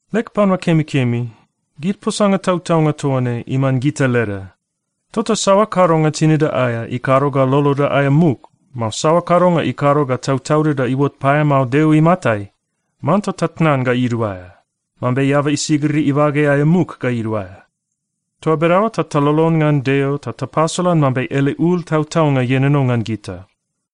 Leg panua kemikemi, gid posanga tautaunga toa ne iman gita leda, tota saoa kadonga tinida aea ikado ga loloda aea muk, mao saoa kadonga ikado ga tautaudida iuot paeamao Deo imatai, manta tatnan ga iduaea, mambe eaba isigiri ibage aea muk ga iduaea. Toa bedaoa ta talolon ngan Deo ta tapasolan mambe ele ul tautaunga ienono ngan gita.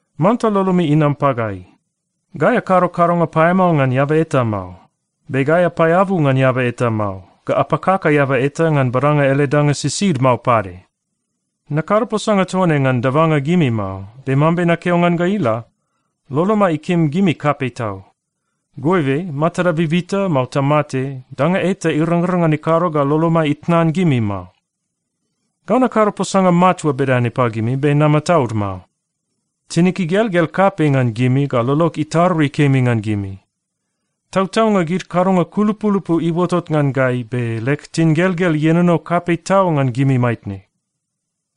Manta lolomi inam pagai. Gai akado kadonga paeamao ngan eaba eta mao. Be gai apaeabu ngan eaba eta mao, ga apakaka eaba eta ngan badanga ele danga sisid mao pade. Nakado posanga toa ne ngan dabanga gimi mao. Be mambe nakeo ngan ga ila, lolomai ikim gimi kapei tau. Goibe matada bibita, mao tamate, danga eta irangrang ngan ikado ga lolomai itnan gimi mao. Gau nakado posanga matua bedane pagimi be namataud mao. Tinig igelgel kapei ngan gimi ga lolog itarui kemi ngan gimi. Tautaunga gid kadonga kulupulupu iuotot ngan gai, be leg tingelgel ienono kapei tau ngan gimi maitne.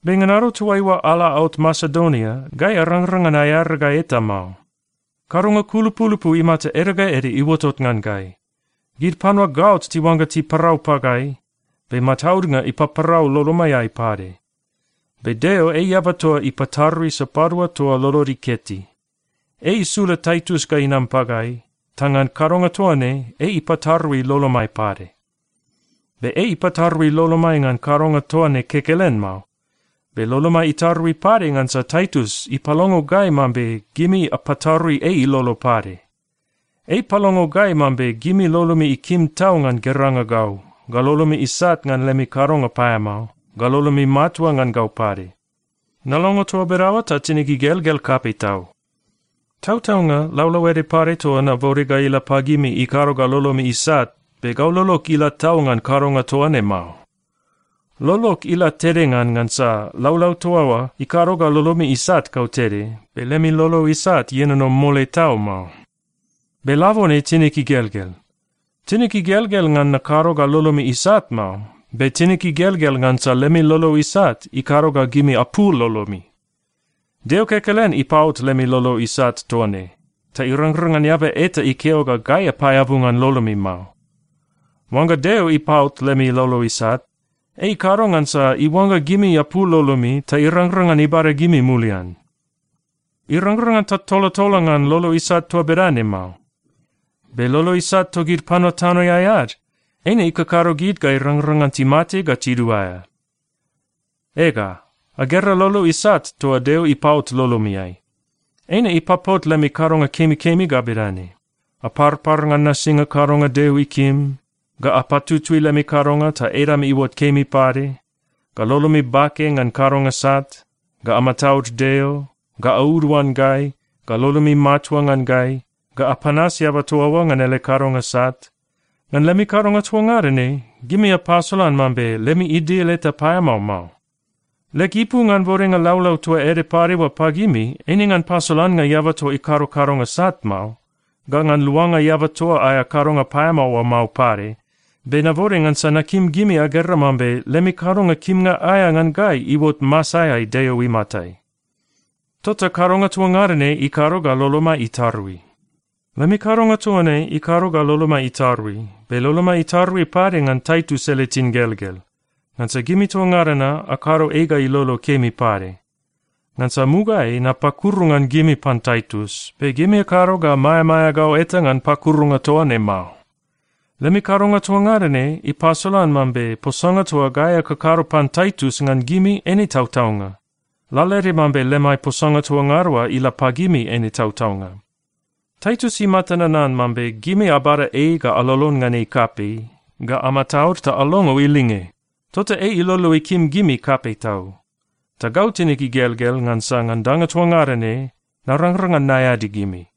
Be ngan ado toaiua ala aot Masedonia, gai arangrang ngan aearagai eta mao. Kadonga kulupulupu imata ede ga ede iuotot ngan gai. Gid panua gaot tiuangga tiparau pagai, be mataudnga ipaparau lolomaiai pade. Be Deo, ei eaba toa ipatarui sapadua toa lolod iketi. Ei isula Taitus ga inam pagai, ta ngan kadonga toa ne, ei ipatarui lolomai pade. Be ei ipatarui lolomai ngan kadonga toa ne kekelen mao, be lolomai itarui pade ngansa Taitus ipalongo gai mambe gimi apatarui ei ilolo pade. Ei ipalongo gai mambe lolomi ikim tau ngan geranga gau, ga lolomi isat ngan lemi kadonga paeamao, ga lolomi matua ngan gau pade. Nalongo toa bedaoa ta tinig igelgel kapei tau. Tautaunga, laulau ede pade toa nabode ga ila pagimi ikado ga lolomi isat, be gau lolog ila tau ngan kadonga toa ne mao. Lolog ila tede ngan, ngansa laulau toa oa ikado ga lolomi isat kautede, be lemi lolo isat ienono mole tau mao. Be labone tinig igelgel. Tinig igelgel ngan nakado ga lolomi isat mao. Be tinig igelgel ngansa lemi lolo isat ikado ga gimi apul lolomi. Deo kekelen ipaot lemi lolo isat toa ne, ta irangrang ngan eaba eta ikeo ga gai apaeabu ngan lolomi mao. Oangga Deo ipaot lemi lolo isat, ei ikado ngansa iuangga gimi apul lolomi ta irangrang ngan ibada gimi mulian. Irangrang ngan tatolatola ngan lolo isat toa bedane mao. Be lolo isat togid panua tanoeai ad, eine ikakado gid ga irangrang ngan timate ga tiduaea. Ega, agera lolo isat toa Deo ipaot lolomiai. Eine ipapot lemi kadonga kemikemi ga bedane: aparpar ngan nasinga kadonga Deo ikim, ga apatutui lemi kadonga ta edami iuot kemi pade, ga lolomi bake ngan kadonga sat, ga amataud Deo, ga auduan gai, ga lolomi matua ngan gai, ga apanas eaba toa oa ngan ele kadonga sat. Ngan lemi kadonga toa ngada ne, gimi apasolan mambe lemi idil eta paeamao mao. Leg ipu ngan bodenga laulau toa ede pade oa pagimi eine ngan pasolannga eaba toa ikado kadonga sat mao, ga ngan luanga eaba toa aea kadonga paeamao oa mao pade. Be nabode ngansa nakim gimi agera mambe lemi kadonga kimnga aea ngan gai iuot masaeai Deo imatai. Tota kadonga toa ngada ne ikado ga lolomai itarui. Lemi kadonga toa ne ikado ga lolomai itarui, be lolomai itarui pade ngan Taitus ele tingelgel. Ngansa gimi toa ngada na akado ei ga ilolo kemi pade. Ngansa mugaeai napakuru ngan gimi pan Taitus, be gimi akado ga maeamaea gau eta ngan pakurunga toa ne mao. Lemi kadonga toa ngada ne ipasolan mambe posanga toa gai akakado pan Taitus ngan gimi eine tautaunga, lalaede mambe lemai posanga toa ngada oa ila pagimi eine tautaunga. Taitus imata nanan mambe gimi abada ei ga alolon ngan ei kapei, ga amataud ta alongo ilinge. Tota ei ilolo ikim gimi kapei tau. Ta gau tinig igelgel ngansa ngan danga toa ngada ne, narangrang ngan naeadi gimi.